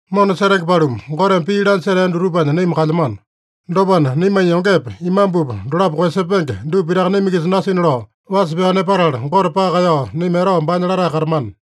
Mona setenge paluma, Goteme pii lanya setea dutupanya naima kalyamano. Dopana, naimanya yongepa, imambupa dolapo koeyasepenge dupa pitaka naima-kisa nasina lao wasa pyao nepatala, Gote paka kaeyao naima etao baanya latae katamana.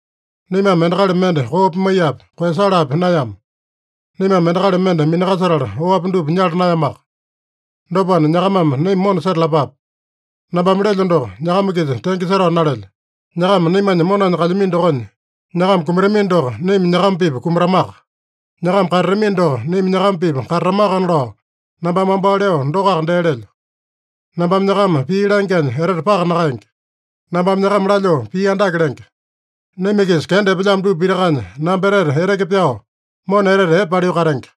Naimame endakali mende koo pimaiyapi, koeyasalapi naeyama. Naimame endakali mende minakasetala oapi dupa nyala naeyamaka. Dopana, nyakamame naima mona setalapape. Nambame lelyo doko, nyakama-kisa tenge setao nalelyo. Nyakama naimanya monanya kalyamino dokonya, nyakama kumatamino doko, naima nyakama-pipa kumatamaka. Nyakama katatamino doko, naima nyakama-pipa katatamakana lao nambame wambao leo dokoaka dee lelyo. Nambame nyakama pii langyanya etete paka nakaenge. Nambame nyakama lalyoo pii andake lenge. Naima-kisa kenda epelyamo dupa pitakanya namba etete eteke pyao, mona etete epe paliu katenge.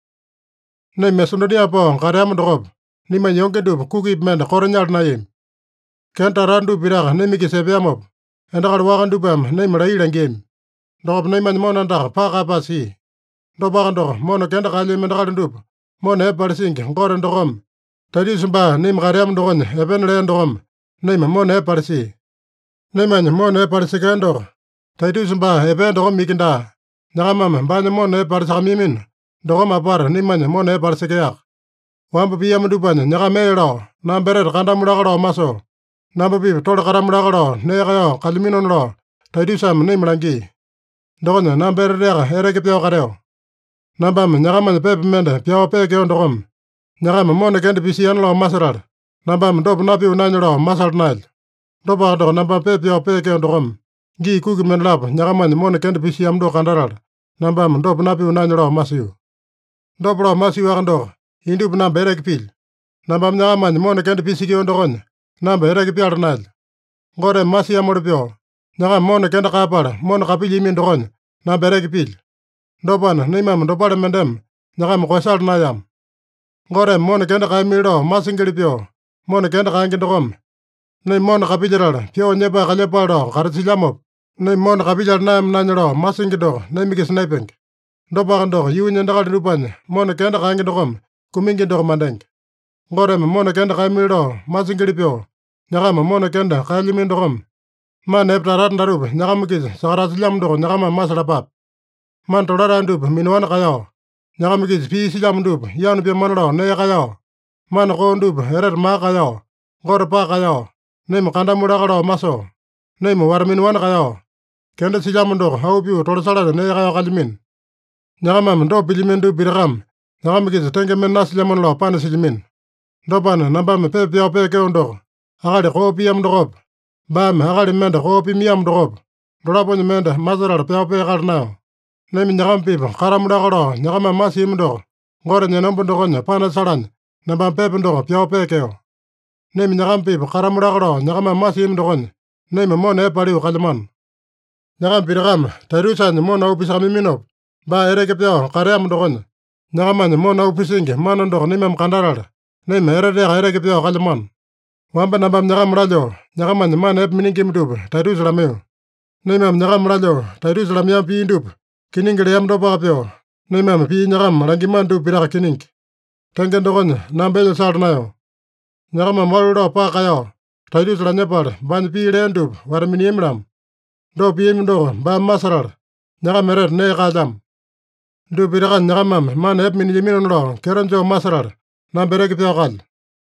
Naima Masedonia pao kateama dokopa, naimanya yonge dupa kukipi mende koto nyala naeyami. Kenda tata-tata dupa pitaka naima-kisa epeamopa, endakali waka dupame naima laiya langiami. Dokopa naimanya mona andaka paka kaeyapae sia. Dopaka doko, mona kenda kaelyami endakali dupa mona epe palisingi Gote dokome, Taitusa baa naima kateama dokonya epena lea dokome naima mona epe palisia. Naimanya mona epe palisekea doko, Taitusa baa epea dokome iki daa, nyakamame baanya mona epe palisakamaiyamino dokome apata naimanya mona epe palisekeaka. Wamba piamo dupanya nyakama ee lao, namba etete kandamu laka lao masoo, namba-pipa tole katamu laka lao nee kaeyao kalyaminona lao Taitusame naima langia. Dokonya namba eteteaka eteke pyao kateo. Nambame nyakamanya pepa mende pyao peekeo dokome, nyakama mona kenda pisiana lao masetala, nambame dopa napio naenya lao masala naelyo. (Dopaka doko, nambame pepa pyao peekeo dokome, gii kuki mendalapo nyakamanya mona kenda pisiamo doko kandatala, nambame dopa napio naenya lao masio.) Dopa lao masiowaka doko, indupa namba eteke pilyo. Nambame nyakamanya mona kenda pisekeo dokonya namba eteke pyala naelyo. Goteme masiamoli pyoo, nyakama mona kenda kaeyapala mona kapilyiamino dokonya namba eteke pilyo. Dopana, naimame dopale mendeme nyakama koeyasala naeyama. Goteme mona kenda kaeyamili lao masingili pyoo mona kenda kaenge dokome, naima mona kapilyetala pyoo nyepae kalyepale lao katasilyamopa, naima mona kapilyala naeyama naenya lao masingi doko naima-kisa naepenge. Dopaka doko, yuunya endakali dupanya mona kenda kaenge dokome kumingi doko mandenge. Goteme mona kenda kaeyamili lao masingili pyoo nyakama mona kenda kaelyamino dokome, mana epe tata-tata datupa nyakama-kisa sakatasilyamo doko nyakamame masalapape: Mana tolatae dupa minaowani kaeyao, nyakama-kisa pii silyamo dupa yanu pyamana lao nee kaeyao, mana koo dupa etete maka kaeyao, Gote paka kaeyao, naima kandamu laka lao masoo, naima wata-minaowani kaeyao, kenda silyamo doko auu pyoo tolasalanya nee kaeyao kalyamino. Nyakamame dopa pilyamino dupa pitakame nyakama-kisa tenge mende nasilyamona lao panasilyamino. Dopana, nambame pepa pyao peekeo doko, akali koo piamo dokopa, baame akali mende koo pimaiyamo dokopa, dolaponya mende masetala pyao peakala naeyo. Naima nyakama-pipa katamu laka lao nyakamame masiami doko Gotenya enomba dokonya panasalanya nambame pepa doko pyao peekeo. Naima nyakama-pipa katamu laka lao nyakamame masiami dokonya, naima mona epe paliu kalyamano. Nyakama pitakame Taitusanya mona auu pisakamaiyaminopa baa eteke pyao kateamo dokonya, nyakamanya mona auu pisingi mana doko naimame kandatala, naima eteteaka eteke pyao kalyamano. Wamba nambame nyakama lalyoo, nyakamanya mana epe miningima dupa Taitusa lamaiyo. Naimame nyakama lalyoo Taitusa lamaiyama pii dupa kiningi leama dopaka pyoo, naimame pii nyakama langiamano dupa pitaka kiningi. Tenge dokonya, namba elya sala naeyo. Nyakamame walu lao paka kaeyao Taitusa lanyepala, baanya pii lea dupa wata-miniami-lamo. Dopa piami doko baame masetala, nyakama etete nee kaelyamo. Dupa pitakanya nyakamame mana epe minalaminona lao kyeto joo masetala, namba eteke pyao kalyo.